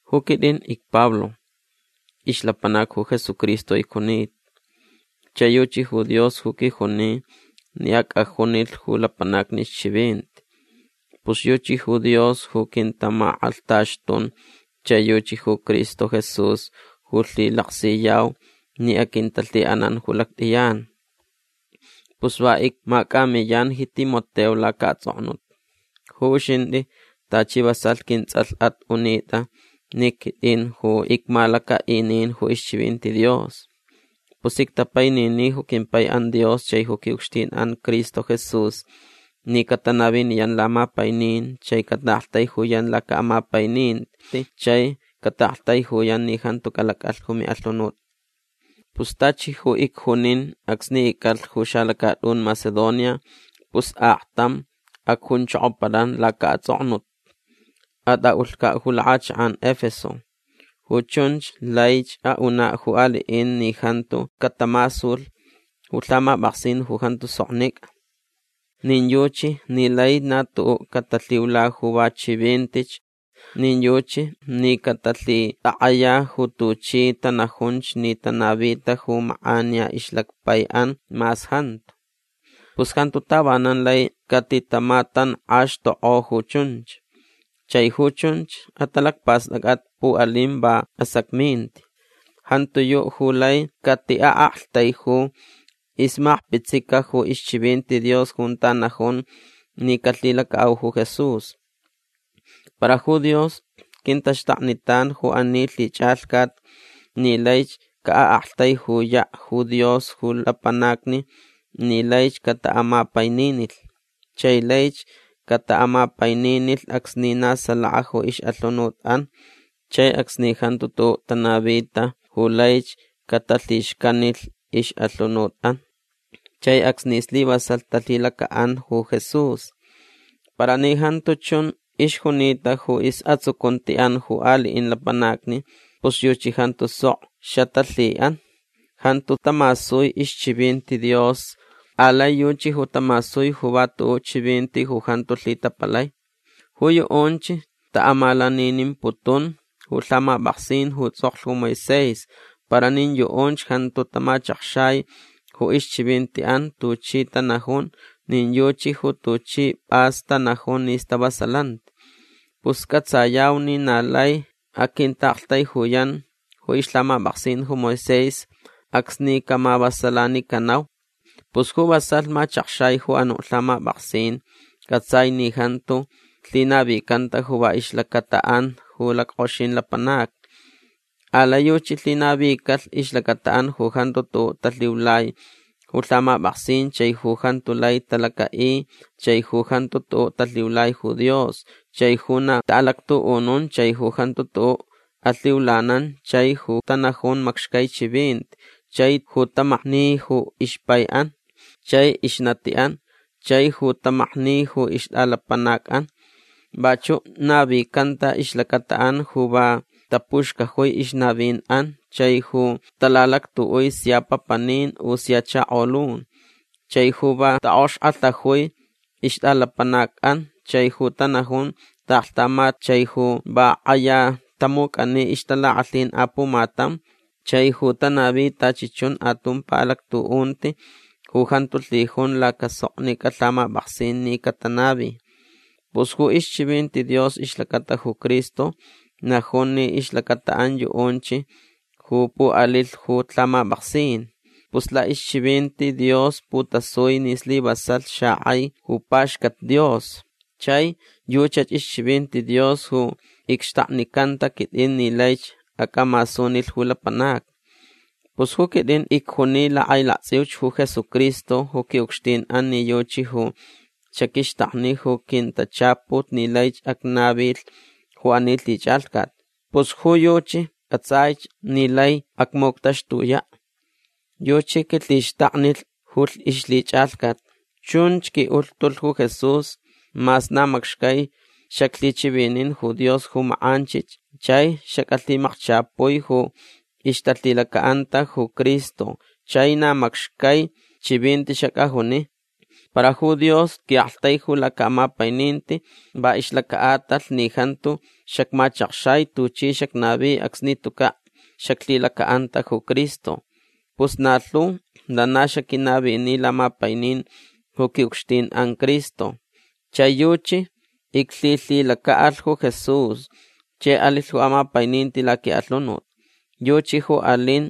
Ju quitʼin icPablo. Ixlapanac ju Jesucristo icjunita. Chai yuchi ju Dios ju quijuni ni acʼajunilh ju lapanacni ixchivinti. Pus yuchi ju Dios ju quintamakʼalhtaxtun chai yuchi ju Cristo Jesús ju lhilaksiyau ni aquintalhiʼanan ju lactʼiyan. Pus va icmacʼamiyan ji Timoteo lacaʼatsʼoknut. Ju uxintʼi tachi vasalh quintsʼalhʼat unitʼa ni quitʼin ju icmalacaʼinin ju ixchivinti Dios. Pus ictapainini ju quimpaiʼan Dios chai ju quiʼucxtinʼan Cristo Jesús ni catanaviniyan lamapainin chai cataʼaktaijuyan lacaʼamapaininti chai cataʼaktaijuyan ni jantu calacʼalh ju miʼalhunut. Pus tachi ju icjunin acsni icʼalh ju xalacatʼun Macedonia pus aktam acjunchokopalan lacaʼatsʼoknut. Atʼaʼulhcaʼ ju lakʼachakʼan Efeso. Ju chunch laich aʼunaʼ ju aliʼin ni jantu catamasulh ju lhamapʼaksin ju jantu soknicʼa. Nin yuchi ni lai na tuʼuʼ catalhiula ju va chivintich. Nin yuchi ni catalhitakʼaya ju tuchi tanajunch ni tanavita ju makʼaniya ixlacpaiʼan mas jantu. Pus jantu tavanan lai catitamatankʼaxtukʼo ju chunch. Chai ju chunch atalacpastʼacʼat puʼalin va asacminti. Jantiyuʼ ju lai catiʼaʼaktaiju ixmakpitsica ju ixchivinti Dios junta najun ni calhilacaʼau ju Jesús. Para ju Dios quintaxtaknitan ju ani lhichʼalhcat ni laich caʼaʼaktaijuyaʼ ju Dios ju lapanacni ni laich cataʼamapaininilh. Chai laich cataʼamapaininilh acsni na salaka ju ixʼalhunutʼan chai acsni jantu tuʼuʼ tanavita ju laich catalhixcanilh ixʼalhunutʼan chai acsni slivasalh talhilacaʼan ju Jesús. Para ni jantu chun ixjunita ju isʼatsucuntiʼan ju aliʼin lapanacni pus yuchi jantu sok xatalhiʼan. Jantu tamasui ixchivinti Dios. Alai yuchi ju tamasui ju va tuʼuʼ chivinti ju jantu lhitapalai. Ju yuʼunch taʼamalaninimputun ju lhamapʼaksin ju tsʼoklh ju Moisés para nin yuʼunch jantu tamachakxai ju ixchivintiʼan tuchi tanajun nin yuchi ju tuchi pʼas tanajun ni stavasalanti. Pus cʼatsayau ni na lai aquintaʼaktaijuyan ju ixlhamapʼaksin ju Moisés acsni camavasalanicanau. Pus ju vasalh machakxai ju anuʼ lhamapʼaksin cʼatsai ni jantu lhinavicanta ju va ixlacataʼan ju lackʼoxin lapanacni. Alai yuchi lhinavicalh ixlacataʼan ju jantu tuʼuʼ talhiulai ju lhamapʼaksin chai ju jantu lai talacaʼi chai ju jantu tuʼuʼ talhiulai ju Dios chai ju na taʼalactuʼunun chai ju jantu tuʼuʼ alhiulanan chai ju tanajun macxcai chivinti chai ju tamakni ju ixpaiʼan chai ixnatiʼan chai ju tamakni ju ixtʼalapanacʼan. Vachuʼ navicanta ixlacataʼan ju va tapuxcajui ixnavinʼan chai ju talalactuʼui sia papanin u sia chakolun chai ju va taʼokxkʼalhajui ixtʼalapanacʼan chai ju tanajun taʼaklhtamat chai ju va kʼaya tamucʼani ixtalakʼalhin apumatam chai ju tanavi tachi chun atumpa alactuʼunti ju jantu lhijun lacasoknicʼa lhamapʼaksin ni catanavi. Pus ju ixchivinti Dios ixlacata ju Cristo najun ni ixlacataʼan yuʼunch ju puʼalilh ju lhamapʼaksin. Pus laʼixchivinti Dios putasui ni slivasalh xakʼai ju paxcat Dios. Chai yuchach ixchivinti Dios ju icxtaknicanta quitʼin ni laich acʼamasunilh ju lapanacni. Pus ju quitʼin icjuni lakʼailaktsʼiuch ju Jesucristo ju quiʼucxtinʼan ni yuchi ju xaquixtakni ju quintachaput ni laich acnavilh ju ani lhichʼalhcat. Pus ju yuchi cʼatsaich ni lai acmuctaxtuyaʼ. Yuchi quilhixtaknilh ju ixlhichʼalhcat. Chunch quiʼulhtulh ju Jesús mas na macxcai xaclhichivinin ju Dios ju makʼanchich chai xacʼalhimakchapui ju ixtalhilacaʼanta ju Cristo chai na macxcai chivinti xacʼajuni. Para ju Dios quiʼaktaiju lacaʼamapaininti va ixlacaʼatalh ni jantu xacmachakxai tuchi xacnavi acsni tucaʼ xaclhilacaʼanta ju Cristo. Pus na lhu lana xaquinavini lamapainin ju quiʼucxtinʼan Cristo. Chai yuchi iclhilhilacaʼalh ju Jesús chai alilh ju amapaininti laquiʼalhunut. Yuchi ju alin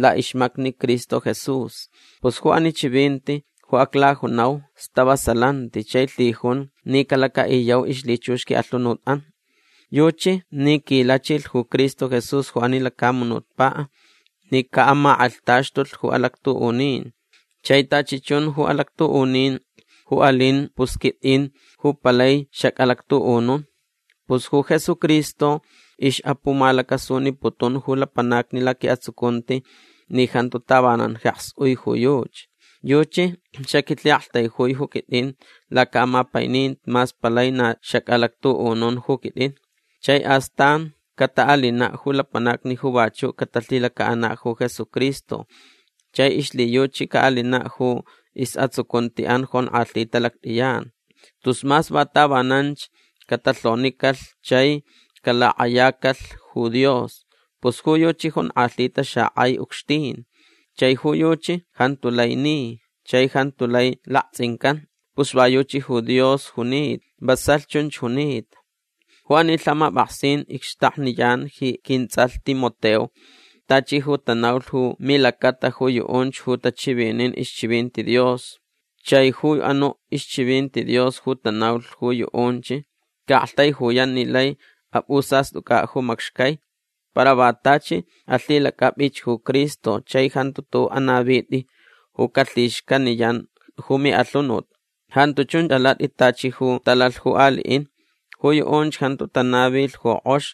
laʼixmacni Cristo Jesús. Pus ju ani chivinti ju aclajunau stavasalanti chai lhijun ni calacaʼiyau ixlhichux quiʼalhunutʼan. Yuchi ni quilachilh ju Cristo Jesús ju ani lacamunutpaʼ ni caʼamakʼalhtaxtulh ju alactuʼunin. Chai tachi chun ju alactuʼunin ju alin pus quitʼin ju palai xacʼalactuʼunun. Pus ju Jesucristo ixʼapumalacasuniputun ju lapanacni laquiʼatsucunti ni jantu tavanan jeks ui ju yuchi. Yuchi xaquilhiʼaktaijui ju quitʼin lacaʼamapaininti mas palai na xacʼalactuʼunun ju quitʼin. Chai astan cataʼalinaʼ ju lapanacni ju vachuʼ catalhilacaʼanaʼ ju Jesucristo chai ixlhiyuchi caʼalinaʼ ju isʼatsucuntiʼan jonkʼalhita lactʼiyan. Tus mas va tavananch catalhonicalh chai calakʼayacalh ju Dios. Pus ju yuchi jonkʼalhita xakʼai ucxtin. Chai ju yuchi jantu lai ni. Chai jantu lai laktsʼincan. Pus va yuchi ju Dios junita. Vasalh chunch junita. Ju ani lhamapʼaksin icxtakniyan ji quintsʼalh Timoteo tachi ju tanaulh ju milacata ju yuʼunch ju tachivinin ixchivinti Dios. Chai ju anuʼ ixchivinti Dios ju tanaulh ju yuʼunch caʼaktaijuyan ni lai apʼusastʼucʼaʼ ju macxcai. Para va tachi alhilacʼapʼich ju Cristo chai jantu tuʼuʼ anavitʼi ju calhixcaniyan ju miʼalhunut. Jantu chun alatʼi tachi ju talalh ju aliʼin. Ju yuʼunch jantu tanavilh ju kʼox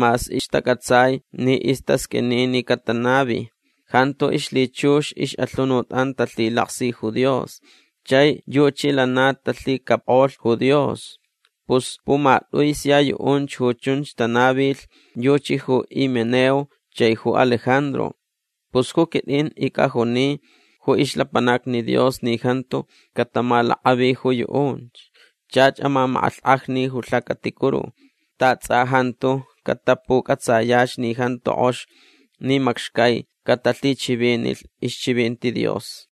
mas ixtacʼatsai ni istasqʼuini ni catanavi. Jantu ixlhichux ixʼalhunutʼan talhilaksi ju Dios. Chai yuchi lana talhicapkʼolh ju Dios. Pus pumatʼui sia yuʼunch ju chunch tanavilh yuchi ju Himeneo chai ju Alejandro. Pus ju quitʼin icʼajuni ju ixlapanacni Dios ni jantu catamalakʼavi ju yuʼunch. Chach amamakʼalhkʼajni ju lhacaticuru. Ta tsʼa jantu catapucʼatsayach ni jantu kʼox ni macxcai catalhichivinilh ixchivinti Dios.